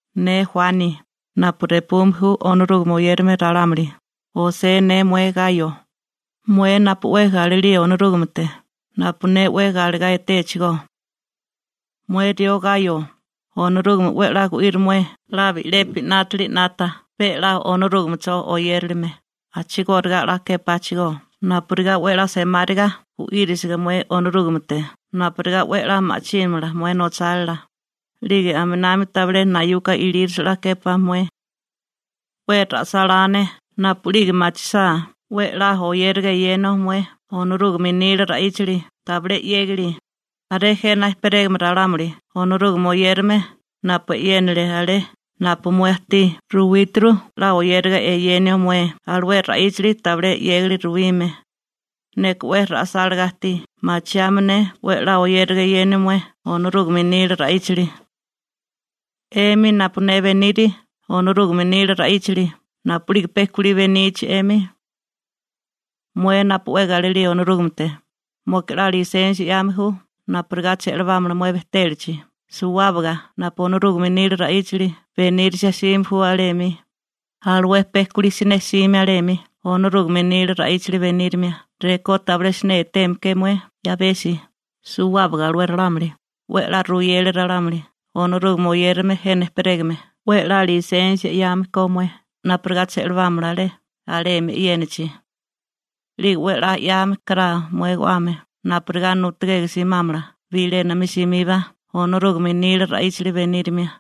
Ne Juani, napu repume ju Onorúgame oyérame ralámuli, osé ne mué Gayo, mué napu 'we galilía Onorúgamete, napu ne 'we galegá etéchigó. Mué rió Gayo, Onorúgame 'we 'la gu'iri mué 'la bi'lepi 'nátili 'nata pe 'la Onorúgamecho oyérilime, a'chigóriga 'la képáchigó napurigá 'we 'la semáriga gu'írisiga mué Onorúgamete napurigá 'we a'lá ma'chínamala mué nochálila, 'lige aminami tabilé nayuka ilírosa 'la képá mué. 'We ra'sálá ne napu'lige machisá 'we 'la oyériga eyenio mué Onorúgame nila ra'íchali tabilé 'yégali, jaré jena ejperégame ralámuli Onorúgame oyérame napu e'yénale alé napu mué ajtí ruwíturu 'la oyériga eyenio mué alué ra'íchali tabilé 'yégali ruwime. Neka 'we ra'sálagá ajtí machiame ne 'we 'la oyériga e'yenio mué Onorúgame nila ra'íchali, 'emi napu ne beniri Onorúgame nila ra'íchali napu'lige pe kulí benichi 'emi. Mué napu 'we galilía Onorúgamete, mueka 'la lisensia 'yame ju napurigá che'lebámala mué bejtélachi suwábaga napu Onorúgame nila ra'íchali benírisia jsime ju alemi, alué pe kulí siné jsime alemi Onorúgame nila ra'íchali benírimia rekó tabilé siné eteme ke mué 'yabesi, suwábaga alué ralámuli 'we 'la ruyele ralámuli Onorúgame oyérame jena ejperégame 'we 'la lisensia 'yame ko mué napurigá che'lebámala alé alemi e'yénachi, 'lige 'we 'la 'yame kará mué go'ame napurigá nutugega simámala bilénami simiba Onorúgame nila ra'íchali benírimia.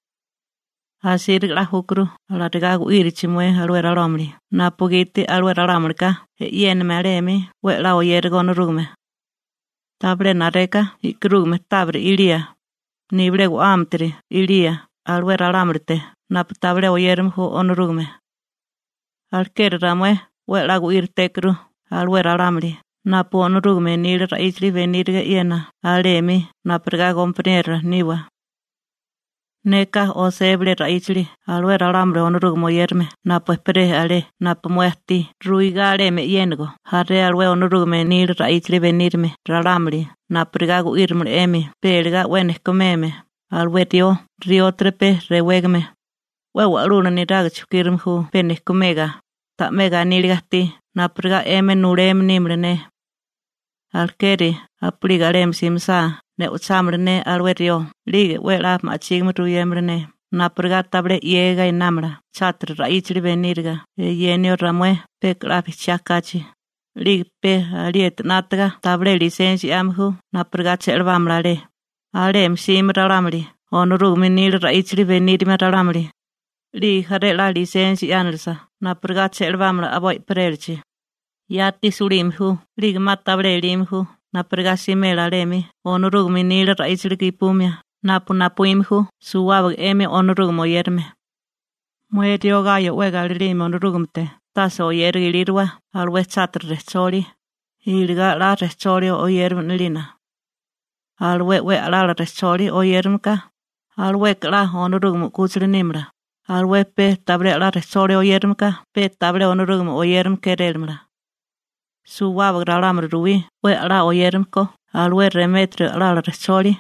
Asíriga 'la júkuru alarigá gu'írichi mué alué ralámuli napugiti alué ralámulika e'yéname alemi 'we 'la oyériga Onorúgame tabilé nareka e'karúgame tábiri i'lía, nibilé go'ámetiri i'lía alué ralámulite napu tabilé oyérame ju Onorúgame. Alekeri ramué 'we 'la gu'íritékuru alué ralámuli napu Onorúgame nila ra'íchali beníriga e'yena alé 'mi napurigá gompaniérola niwa. Neka osé bilé ra'íchali alué ralámuli Onorúgame oyérame napu ejperé alé napu mué ajtí ruigá alemi e'yénigo jaré alué Onorúgame nila ra'íchali benírame ralámuli napurigá gu'írimala 'emi pe iligá 'we nejkumeme alué rió Riótrepe rewégame, 'we wa'lula neraga chujkírime ju pe nejkumega, ta'mé ganíliga ajtí napurigá 'emi nuleme nímala ne. Alekeri napu'lige alemi simisá ne'ochámala ne alué rió 'lige 'we 'la ma'chígime ruyémala ne napurigá tabilé 'yégiga einámala chátiri ra'íchali beníriga e'yenio ramué peka 'la bijchiá kachi, 'lige pe alieti 'nátaga tabilé lisensia 'yame ju napurigá che'lebámala alé, alemi jsime ralámuli Onorúgame nila ra'íchali benírimia ralámuli, 'lige jaré 'la lisensia 'yánilisa napurigá che'lebámala a'boi ejperélachi, yati sulime ju 'lige 'ma tabilé elime ju napurigá simela alé 'mi Onorúgame nila ra'íchali gepumia napu napuíme ju suwábaga 'emi Onorúgame oyérame. Mué rió Gayo 'we galilime Onorúgamete tase oyériga ilíriwa alué chátiri rejcholi, iligá a'lá rejcholi oyériwa 'nalina. Alué 'we a'lala rejcholi oyérame ka, alueka 'la Onorúgame 'kúchila nímala, alué pe tabilé a'lá rejcholi oyérame ka pe tabilé Onorúgame oyérame kérélamala. Suwábaga ralámuli ruwí 'we a'lá oyérame ko alué Remetrio a'lala rejcholi,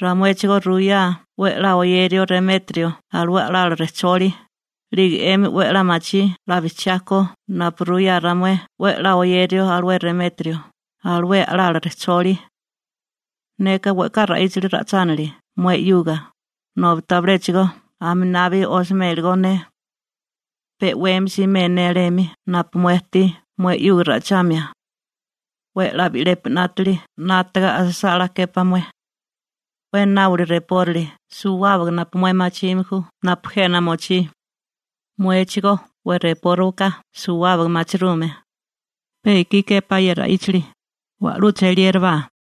ramuéchigó ruwiyá 'we 'la oyerio Remetrio alué a'lala rejcholi, 'lige 'emi 'we 'la machí 'la bijchiá ko napu ruyá ramué 'we 'la oyerio alué Remetrio alué a'lala rejcholi. Neka we'ká ra'íchali ra'ichánili mué 'yuga, nobi tabiléchigo aminabi osimélagó ne. Pe 'wemi simea ne alemi napu mué ajtí mué 'yuga ra'ichamia. 'We 'la bi'lepi 'nátili 'nátaga asisá 'la képá mué. 'We nábole reporali suwábaga napu mué machime ju napu jena mochí. Muéchigó 'we repóriwaká suwábaga machirume. Pe ekí képá ye ra'íchali. Wa'lú cheliérabá.